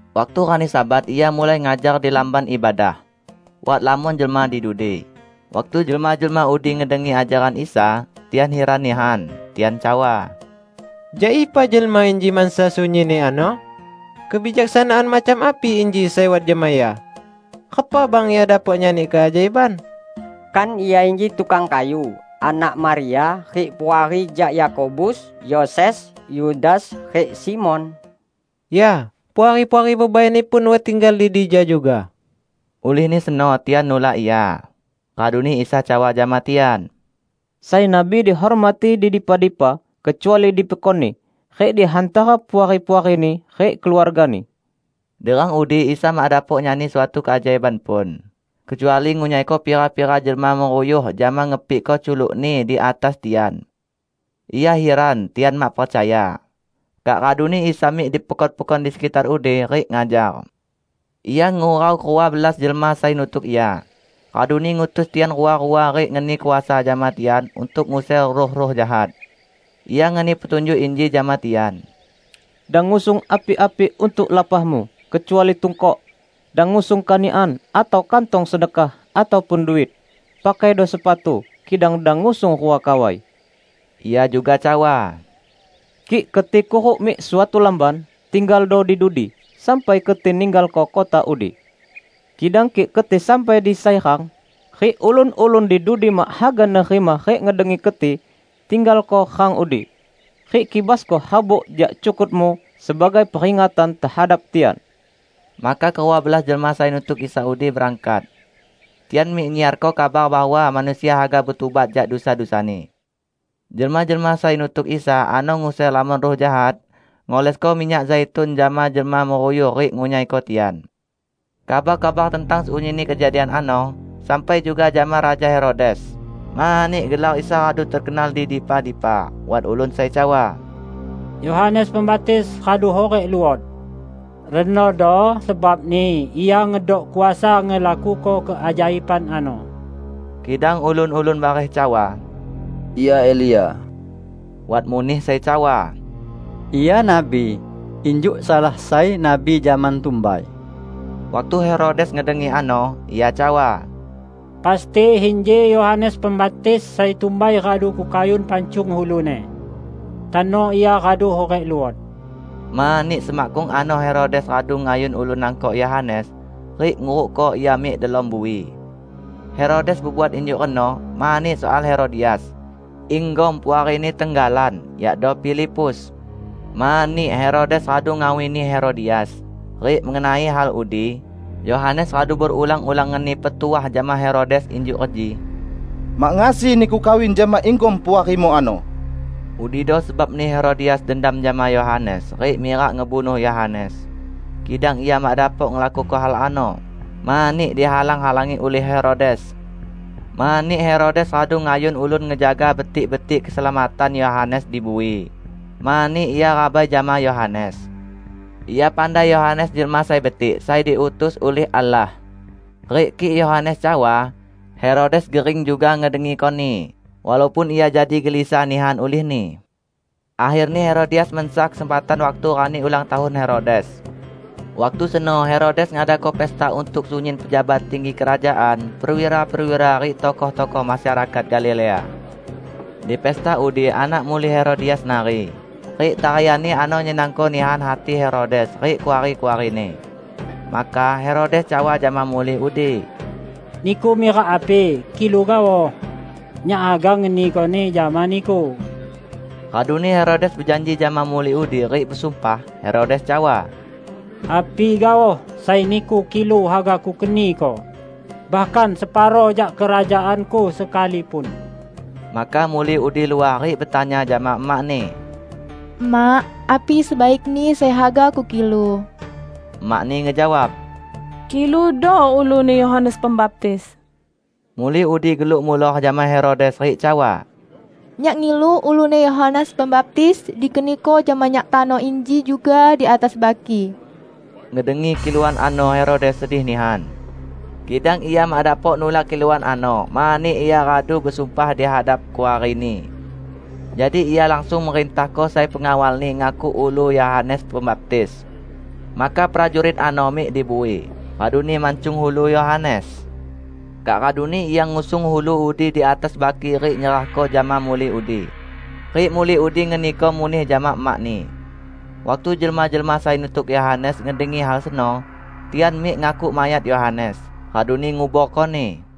Waktu rani Sabat Ia mulai ngajar di lamban ibadah. Wat lamon jelma di dudi. Waktu jelma-jelma udi ngedengi ajaran Isa, tian hiran nihan. Tian cawa, "Jak ipa jelma inji mansa sunyinni ano? Kebijaksanaan macam api inji sai wat jama Ia? Repa bang Ia dapok nyani keajaiban? Kan Ia inji tukang kayu, anak Maria, rik puari jak Yakobus, Yoses, Yudas rik Simon? Ya, puari-puari bebai-Ni pun wat tinggal di dija juga." Ulihni seno tian nulak Ia. Raduni Isa cawa jama tian, "Sai nabi dihormati di dipa-dipa, kecuali di pekonni, rik di hantara puari-puarini rik keluargani." Di rang udi Isa mak dapok nyani suatu keajaiban pun, kecuali ngunyaiko pira-pira jelma meruyuh jama ngepikko culuk-Ni di atas tian. Ia hiran tian mak percaya. Kak raduni Isa mik di pekon-pekon di sekitar udi, rik ngajar. Ia ngurau kerua belas jelma sai nutuk Ia, raduni ngutus tian rua-rua rik ngeni kuasa jama tian untuk nguser ruh-ruh jahat. Ia ngeni petunjuk inji jama tian, "Dang ngusung api-api untuk lapahmu, kecuali tungkok. Dang ngusung kanikan atau kantong sedekah, ataupun duit. Pakaido sepatu, kidang dang ngusung rua kawai." Ia juga cawa, "Kik keti kuruk mik suatu lamban, tinggaldo di dudi sampai keti ninggalko kota udi. Kidang kik keti sampai di sai rang, rik ulun-ulun di dudi mak haga nerima rik ngedengi keti, tinggalko rang udi. Rik kibasko harbuk jak cukutmu sebagai peringatan tehadap tian!" Maka kerua belas jelma sai nutuk Isa udi berangkat. Tian mik nyiarko kabar bahwa manusia haga betubat jak dusa-dusani. Jelma-jelma sai nutuk Isa ano nguser lamon ruh jahat, ngolesko minyak zaitun jama jelma meruyuh rik ngunyaiko tian. Kabar-kabar tentang sunyinni kejadian ano sampai juga jama Raja Herodes, mani gelar Isa radu tekenal di dipa-dipa. Wat ulun sai cawa, "Yohanes Pembaptis radu hurik luot! Renodo sebabni Ia ngedok kuasa ngelakuko keajaiban ano." Kidang ulun-ulun bareh cawa, "Ia Elia." Wat muneh sai cawa, "Ia nabi, injuk salah sai nabi zaman tumbai." Waktu Herodes ngedengi ano, ia cawa, "Pasti inji Yohanes Pembaptis sai tumbai radu kukayun pancung uluni. Tano ia radu hurik luot!" Mani semakkung ano Herodes radu ngayun ulun nangkok Yohanes, rik ngurukko ia mik delom bui. Herodes bebuat injuk reno mani soal Herodias, inggom puarini tenggalan, yakdo Filipus. Mani Herodes radu ngawini Herodias, rik mengenai hal udi Yohanes radu berulang-ulang ngeni petuah jama Herodes injuk reji, "Mak ngasi niku kawin jama inggom puarimu ano!" Udido sebabni Herodias dendam jama Yohanes rik mirak ngebunuh Yohanes, kidang ia mak dapok ngelakuko hal ano, mani dihalang-halangi ulih Herodes. Mani Herodes radu ngayun ulun ngejaga betik-betik keselamatan Yohanes di bui, mani ia rabai jama Yohanes. Ia pandai Yohanes jelma sai betik sai diutus ulih Allah. Rik kik Yohanes cawa, Herodes gering juga ngedengikoni, walaupun ia jadi gelisah nihan ulihni. Akherni Herodias mansa kesempatan waktu rani ulang tahun Herodes. Waktu seno Herodes ngadako pesta untuk sunyin pejabat tinggi kerajaan, perwira-perwira rik tokoh-tokoh masyarakat Galilea. Di pesta udi anak muli Herodias nari, rik tarianni ano nyenangko nihan hati Herodes rik kuari-kuarini. Maka Herodes cawa jama muli udi, "Niku mirak api, kilu gaoh. Nyak haga ngenikoni jama niku!" Raduni Herodes bejanji jama muli udi rik besumpah. Herodes cawa, "Api gaoh sai niku kilu haga kukeniko, bahkan separo jak kerajaanku sekalipun!" Maka muli udi luah rik betanya jama emakni, "Emak, api sebaikni sai haga kukilu?" Emakni ngejawab, "Kiludo uluni Yohanes Pembaptis." Muli udi geluk muloh jama Herodes rik cawa, "Nyak ngilu uluni Yohanes Pembaptis dikeniko jama nyak tano inji juga di atas baki!" Ngedengi kiluan ano Herodes sedih nihan. Kidang ia mak dapok nulak kiluan ano mani ia radu besumpah di hadap kuarini. Jadi ia langsung merintahko sai pengawalni ngakuk ulu Yohanes Pembaptis. Maka prajurit ano mik di bui, raduni mancung ulu Yohanes. Kak raduni ia ngusung ulu udi di atas baki rik nyerahko jama muli udi. Rik muli udi ngeniko muneh jama emakni. Waktu jelma-jelma sai nutuk Yohanes ngedengi hal seno, tian mik ngakuk mayat Yohanes, raduni nguborkoni.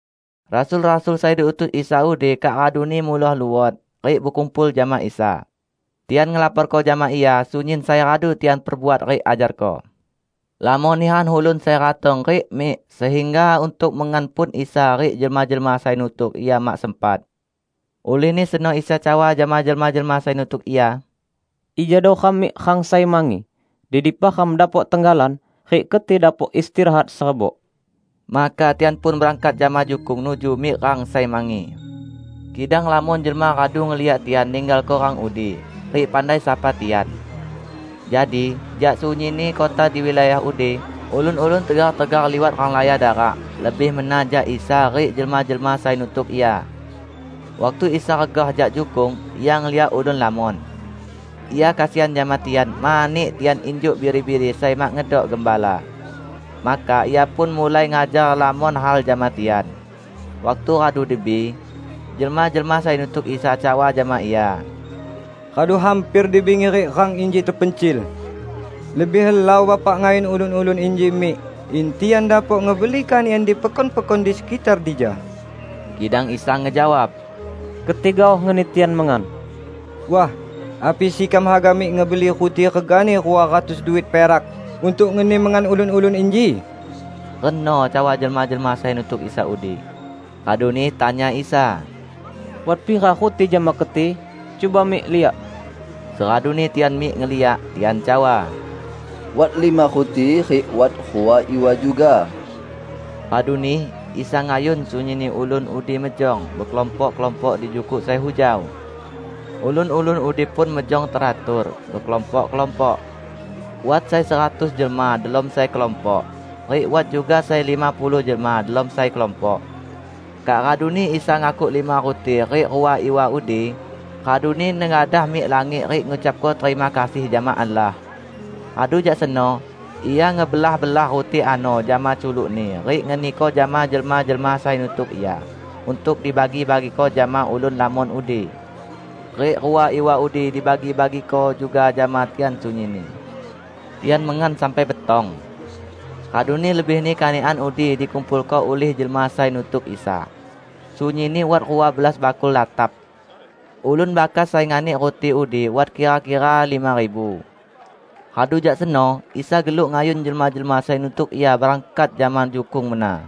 Rasul-rasul sai diutus Isa udi kak raduni muloh luot, rik bekumpul jama Isa. Tian ngelaporko jama Ia sunyin sai radu tian perbuat rik ajarko. Lamon nihan ulun sai ratong rik mik, sehingga untuk mengan pun Isa rik jelma-jelma sai nutuk Ia mak sempat. Ulihni seno Isa cawa jama jelma-jelma sai nutuk Ia, "Ijado ram mik rang sai mangi, di dipa ram dapok tenggalan rik keti dapok istirahat serebok." Maka tian pun berangkat jama jukung nuju mik rang sai mangi. Kidang lamon jelma radu ngeliak tian ninggalko rang udi, rik pandai sapa tian. Jadi, jak sunyinni kota di wilayah udi, ulun-ulun tegar-tegar liwat renglaya darak lebih mena jak Isa rik jelma-jelma sai nutuk Ia. Waktu Isa regah jak jukung, Ia ngeliak ulun lamon. Ia kesian jama tian, mani tian injuk biri-biri sai mak ngedok gembala. Maka Ia pun mulai ngajar lamon hal jama tian. Waktu radu dibi, jelma-jelma sai nutuk Isa cawa jama Ia, "Radu hamper di bingi rik rang inji tepencil. Lebih helau Bapak ngayun ulun-ulun inji mik, in tian dapok ngebeli kanikan di pekon-pekon di sekitar dija." Kidang Isa ngejawab, "Keti gaoh ngeni tian mengan." "Wah, api sekam haga mik ngebeli ruti regani rua ratus duit perak untuk ngeni mengan ulun-ulun inji?" reno cawa jelma-jelma sai nutuk Isa udi. Raduni tanya Isa, "Wat pira ruti jama keti? Cuba mik liak." Seraduni tian mik ngeliak, tian cawa, "Wat lima ruti rik wat rua iwa juga." Raduni Isa ngayun sunyinni ulun udi mejong bekelompok-kelompok di jukuk sai hujau. Ulun-ulun udi pun mejong teratur, bekelompok-kelompok. Wat sai seratus jelma delom sai kelompok, rik wat juga sai lima puluh jelma delom sai kelompok. Kak raduni Isa ngakuk lima ruti rik rua iwa udi, raduni nengadah mik langit rik ngucapko terima kasih jama Allah. Radu jak seno, Ia ngebelah-belah ruti ano jama culuk-Ni rik ngeniko jama jelma-jelma sai nutuk Ia untuk dibagi-bagiko jama ulun lamon udi. Rik rua iwa udi dibagi-bagiko juga jama tian sunyinni. Tian mengan sampai betong. Raduni lebihni kanikan udi dikumpulko ulih jelma sai nutuk Isa -- sunyinni wat rua belas bakul latap. Ulun bakas sai nganik ruti udi wat kira-kira lima ribu. Radu jak seno Isa geluk ngayun jelma-jelma sai nutuk Ia berangkat jama jukung mena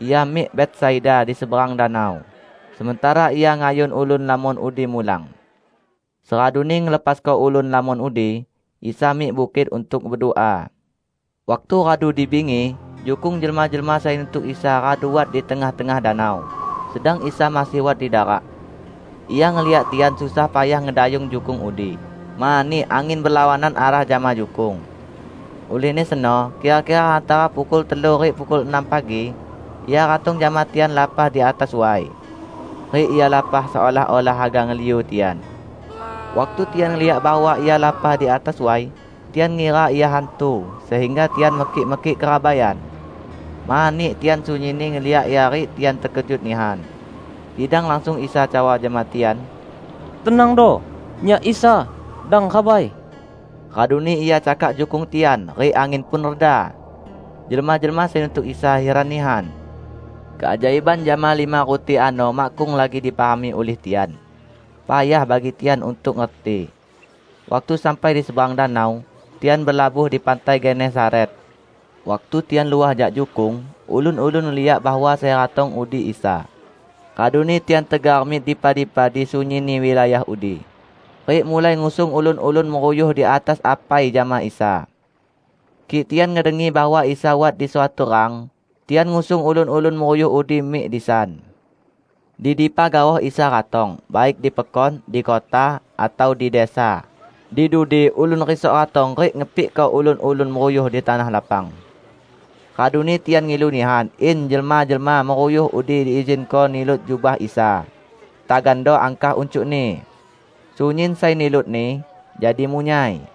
Ia mik Betsaida di seberang danau, sementara Ia ngayun ulun lamon udi mulang. Seraduni ngelepasko ulun lamon udi, Isa mik bukit untuk bedua. Waktu radu di bingi, jukung jelma-jelma sai nutuk Isa radu wat di tengah-tengah danau, sedang Isa masih wat di darak. Ia ngeliak tian susah payah ngedayung jukung udi mani angin belawanan arah jama jukung. Ulihni seno, kira-kira hantara pukul telu rik pukul enam pagi, Ia ratong jama tian lapah di atas way. Rik Ia lapah seolah-olah haga ngeliu tian. Waktu tian ngeliak bahwa Ia lapah di atas way, tian ngira Ia hantu, sehingga tian mekik-mekik kerabaian. Mani tian sunyinni ngeliak Ia rik tian tekejut nihan. Kidang langsung Isa cawa jama tian, "Tenangdo! Nyak Isa. Dang rabai!" Raduni Ia cakak jukung tian, rik angin pun reda. Jelma-jelma sai nutuk Isa hiran nihan. Keajaiban jama lima ruti ano makkung lagi dipahami ulih tian. Payah bagi tian untuk ngerti. Waktu sampai di seberang danau, tian belabuh di pantai Genesaret. Waktu tian luah jak jukung, ulun-ulun ngeliak bahwa sai ratong udi Isa. Raduni tian tegar mik dipa-dipa di sunyinni wilayah udi, rik mulai ngusung ulun-ulun meruyuh di atas apai jama Isa. Kik tian ngedengi bahwa Isa wat di suatu rang, tian ngusung ulun-ulun meruyuh udi mik disan. Di dipa gaoh Isa ratong -- baik di pekon, di kota atau di desa -- di dudi ulun risok ratong rik ngepikko ulun-ulun meruyuh di tanah lapang. Raduni tian ngilu nihan in jelma-jelma meruyuh udi diizinko nilut jubah Isa, tagando angkah uncukni. Sunyin sai nilutni, jadi munyai.